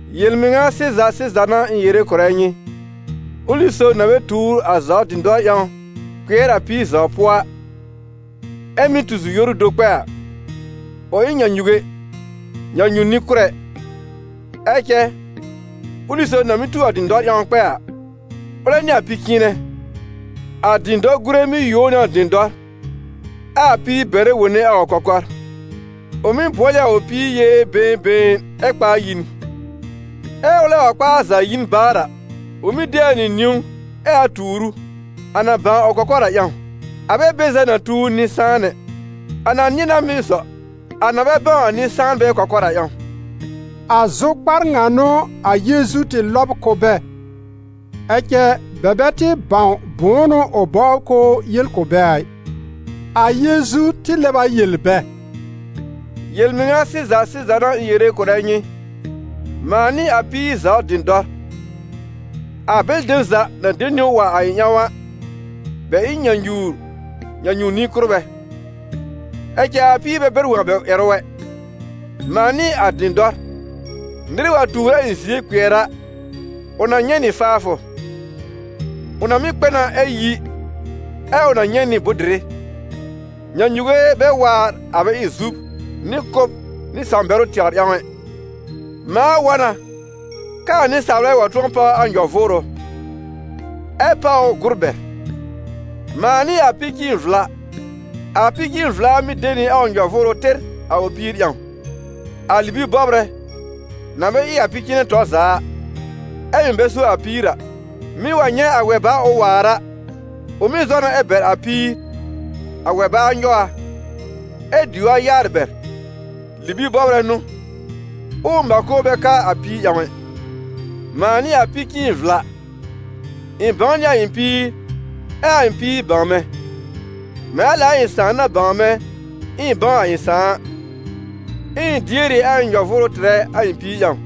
«Yel-mɩŋa sɩza sɩza n'a ɩ̃ yere kʋ̀rɛ nyɩ, ʋlɩ sob na bɛ tuur a zaw dɩ̃dɔr ƴãw kpɩɛr a píir zaw pʋɔ a, ɛ mɩ́ tu zi-yoru do kpɛ a, ʋ ɩ n nyãnyuge, nyãnyu-nɩ-kʋ́rɛ. Ɛ cɛ ʋlɩ sob na mɩ́ tu a dɩ̃dɔr ƴãw kpɛ a, ʋlɛ n'ɩ a pi-cɩ̃ɩnɛ. A dɩ̃dɔr-gùre mɩ́ yuo ʋ nɩ a dɩ̃dɔr, ɛ a píir bɛrɛ wone a ʋ kɔkɔr. Ʋ mɩ́ bʋɔl ɩ a ʋ píir yee been been, ɛ kpa a yi n. Ɛ́ ʋlɛ wa kpa a za yi n baar a, ʋ mɩ́ de a nɩ niwn, ɛ a tuur ʋ, a na bãw a ʋ kɔkɔr a ƴãw. A bɛ be za na tu nɩ-sãan ɛ, a na nɩ̃ɛ na mɩ́ zɔ, a na bɛ bãw a nɩ-sãanbɛ kɔkɔr a ƴãw.» A zʋkpar ŋa n'ʋ a Yeezu tɩ lɔb kʋ̀ bɛ, ɛ cɛ bɛ bɛ tɩ bãw bʋ̃ʋ n'ʋ ʋ bɔbr k'ʋʋ yel kʋ̀ bɛ a ɩ. A Yeezu tɩ lɛb a yel bɛ: «Yel-mɩŋa sɩza sɩza n'a ɩ̃ yere kʋ̀rɛ nyɩ: mãa n'ɩ a píir zaw dɩ̃dɔr. A bɛlɩ dem za na de niwn wa a ɩ̃ ƴãw a, bɛ ɩ n nyãnyuwr, nyãnyu-nɩ-kʋ́rbɛ, ɛ cɛ a píir bɛ bɛr wõ a bɛ ƴɛrʋ ɛ. Mãa n'ɩ a dɩ̃dɔr. Nɩr wa tuur a ɩ̃ zie kpɩɛr a, ʋ na nyɛ̃ nɩ faafʋ. Ʋ na mɩ́ kpɛ na ɛ yi, ɛ ʋ na nyɛ̃ nɩ bʋ̃-dɩrɩ. Nyãnyuge bɛ waar, a bɛ ɩ zub nɩ kʋ́b nɩ sãw-bɛrʋ tɛwr ƴãw ɛ. Mãa wa na kɛ a nɩsaalbɛ wa tʋ̃ɔ páw a nyɔ-vʋʋrʋ, ɛ páw ʋ gʋr bɛr. Mãa n'ɩ a pi-cɩ̃ɩn-vla. A pi-cɩ̃ɩn-vla mɩ́ de nɩ a ʋ nyɔ-vʋʋrʋ tɩr a ʋ píir ƴãw. A libi-bɔbrɛ, na bɛ ɩ a pi-cɩ̃ɩnɛ tɔr za a, ɛ mɩ̀ bɛ so a píir a, mɩ́ wa nyɛ̃ a wɛ-baa ʋ waar a, ʋ mɩ́ zɔ na ɛ bɛr a píir, a wɛ-baa nyɔw a, ɛ diw a yaarɩ bɛr. Libi-bɔbrɛ n'ʋ, ɛ ʋ mãko bɛ ka a píir ƴãw ɛ. Mãa n'ɩ a pi-cɩ̃ɩn-vla. Ɩ̃ bãw nɩ a ɩ̃ píir ɛ a ɩ̃ píir bãw mɛ̃, mɛ̃ a lɛ a ɩ̃ Sãà na bãw mɛ̃ ɛ ɩ̃ bãw a ɩ̃ Sãà a, ɛ ɩ̃ dier ɩ a ɩ̃ nyɔ-vʋʋrʋ tɩrɛ a ɩ̃ píir ƴãw.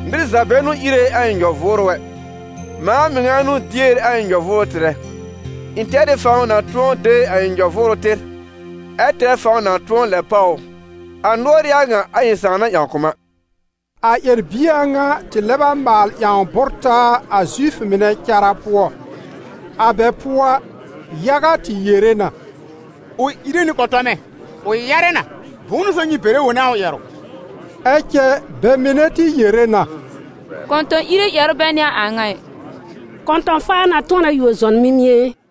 Nɩr za bɛ n'ʋ íre a ɩ̃ nyɔ-vʋʋrʋ ɛ, mãa mɩŋa n'ʋ dier a ɩ̃ nyɔ-vʋʋrʋ tɩrɛ. Ɩ̃ tɛr ɩ fãw na tʋ̃ɔ de a ɩ̃ nyɔ-vʋʋrʋ tɩr, ɛ tɛr fãw na tʋ̃ɔ lɛb páw ʋ: a nʋɔr ɩ a ŋa a ɩ̃ Sãà na ƴãw kʋ̀ m a.» A ƴɛr-bie a ŋa tɩ lɛb a maal ƴãw bʋ́r-taa a Zifʋ mɩnɛ cara pʋɔ. A bɛ pʋɔ a, yaga tɩ yere na: «Ʋ ìre nɩ kɔ̃tɔmɛ! Ʋ yarɛ na! Bʋ̃ʋ n'ʋ so nyɩ bɛrɛ wone a ʋ ƴɛrʋ?» Ɛ cɛ bɛ mɩnɛ tɩ yere na: «Kɔ̃tɔ̃-ìre ƴɛrʋ bɛ n'ɩ a a ŋa ɩ; kɔ̃tɔ̃-faa na tʋ̃ɔ na yuo zɔn mimie e?»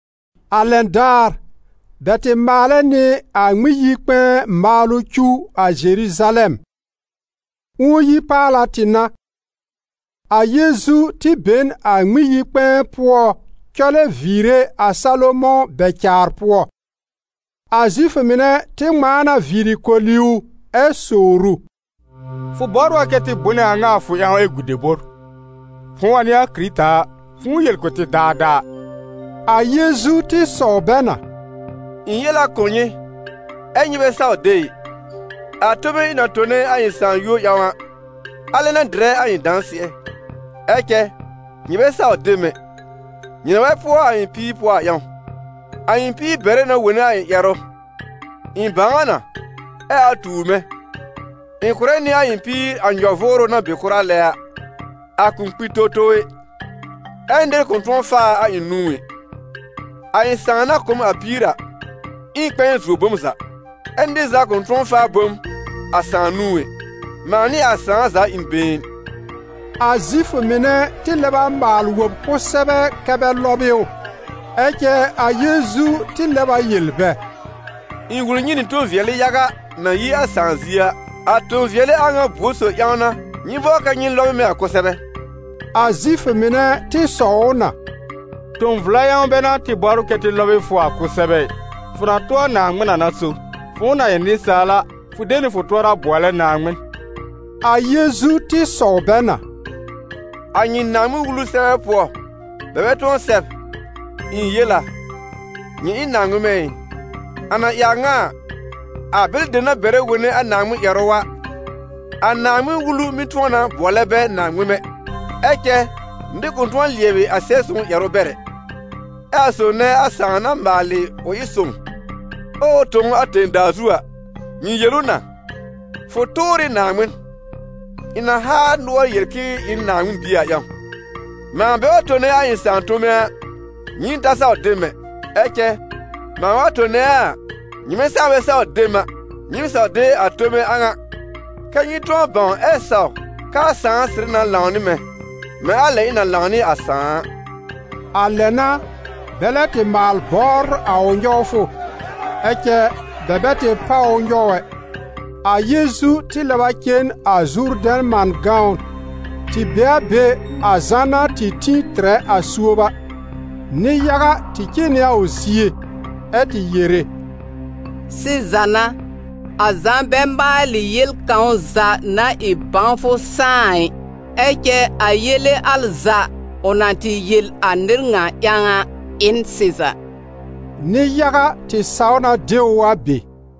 A lɛn daar, bɛ tɩ maalɛ nɩ a Ŋmɩn-yi-kpɛ̃ɛ maalʋ cuw a Zeruzalɛm. Ũo-yi-paala tɩ n'a. A Yeezu tɩ be n a Ŋmɩn-yi-kpɛ̃ɛ pʋɔ cɔlɛ viire a Salomɔ̃ bɛ-caar pʋɔ. A Zifʋ mɩnɛ tɩ ŋmãa na viiri koli ʋ ɛ sowr ʋ: «Fʋ bɔbr a kɛ tɩ bʋnɛ a ŋa a fʋ ƴãw ɛ gu debor? Fʋ̃ʋ wa n'ɩ a Kɩrɩta a, fʋ̃ʋ yel kʋ̀ tɩ daadaa!» A Yeezu tɩ sɔw bɛ na: «Ɩ̃ yel a kʋ̀ nyɩ, ɛ́ nyɩ bɛ saw de ɩ. A tome ɩ̃ na tone a ɩ̃ Sãà yúor ƴãw a, alɛ n'a dɩrɛ a ɩ̃ dãsɩɛ. Ɛ cɛ nyɩ bɛ saw de m ɛ, nyɩ na bɛ pʋɔ a ɩ̃ píir pʋɔ a ƴãw. A ɩ̃ píir bɛrɛ na wone a ɩ̃ ƴɛrʋ, ɩ̃ bãw a na ɛ a tuur mɛ̃. Ɩ̃ kʋ̀rɛ nɩ a ɩ̃ píir a nyɔ-vʋʋrʋ na be kʋra lɛ a: a kʋ̃ kpi towtow ɛ, ɛ nɩr kʋ̃ tʋ̃ɔ faa a a ɩ̃ nũú ɛ. A ɩ̃ Sãà na kʋ̀ m a píir a ɩ n kpɛ̃ɛ zuo bom za, ɛ́ nɩr za kʋ̃ tʋ̃ɔ faa bom a Sãà nũú ɛ: mãa nɩ a Sãà za ɩ n been.» A Zifʋ mɩnɛ tɩ lɛb a maal wob kʋsɛbɛ kɛ́ bɛ lɔb ɩ ʋ. Ɛ cɛ a Yeezu tɩ lɛb a yel bɛ: «Ɩ̃ wul nyɩ nɩ tõ-vɩɛlɩ yaga na yi a Sãà zie a. A tõ-vɩɛlɩ a ŋa buor sob ƴãw n'a nyɩ bɔbr kɛ nyɩ lɔb ɩ mɛ̃ a kʋsɛbɛ?» A Zifʋ mɩnɛ tɩ sɔw ʋ na: «Tõ-vla ƴãw bɛ n'a tɩ bɔbr kɛ tɩ lɔb ɩ fʋ a kʋsɛbɛ ɩ. Fʋ na tʋ a Naaŋmɩn a n'a so: fʋ̃ʋ na ɩ nɩsaal a, fʋ de nɩ fʋ tʋɔra bʋɔlɛ Naaŋmɩn.» A Yeezu tɩ sɔw bɛ na: «A nyɩ Naaŋmɩn-Wulu sɛbɛ pʋɔ bɛ bɛ tʋ̃ɔ sɛb: ‹Ɩ̃ yel a: nyɩ ɩ n naaŋmɩmɛ› ɩ? A na ɩ a ŋa a, a bɛlɩ dem na bɛrɛ wone a Naaŋmɩn-ƴɛrʋ a, a Naaŋmɩn-Wulu mɩ́ tʋ̃ɔ na bʋɔlɛ bɛ naaŋmɩmɛ. Ɛ cɛ nɩr kʋ̃ tʋ̃ɔ lɩɛbɩ a Sɛb-sõw ƴɛrʋ bɛr ɛ. Ɛ a sob nɛ a Sãà na maalɩ ʋ ɩ sõw, ɛ ʋ tõ ʋ a tẽ-daa zu a, nyɩ yel ʋ na: ‹Fʋ tʋʋr ɩ Naaŋmɩn›, ɩ̃ na haa nʋɔr yel k'ɩ̃ɩ ɩ n Naaŋmɩn Bie a ƴãw. Mãa bɛ wa tone a ɩ̃ Sãà tome a, nyɩɩm ta saw de m ɛ! Ɛ cɛ mãa wa tone a a, nyɩmɛ saa bɛ saw de m a, nyɩɩm saw de a tome a ŋa, kɛ́ nyɩ tʋ̃ɔ bãw ɛ saw kɛ a Sãà sɩrɩ na lãw nɩ mɛ̃, mɛ̃ a lɛ ɩ̃ na lãw nɩ a Sãà a.» A lɛ n'a bɛ lɛb tɩ maal bɔbr a ʋ nyɔwfʋ, ɛ cɛ bɛ bɛ tɩ páw ʋ nyɔw ɛ. A Yeezu tɩ lɛb a cen a Zurdɛ̃ man gãwn, tɩ be a be a Zã na tɩ tĩ tɩrɛ a suob a. Nɩ-yaga tɩ cen nɩ a ʋ zie, ɛ tɩ yere: «Sɩza n'a, a Zã bɛ maalɩ yel kãw za na ɩ bãwfʋ sãá a ɩ, ɛ cɛ a yele al za, ʋ na tɩ yel a nɩr ŋa ƴãw a, ɩ n sɩza.» Nɩ-yaga tɩ saw na de ʋ a be.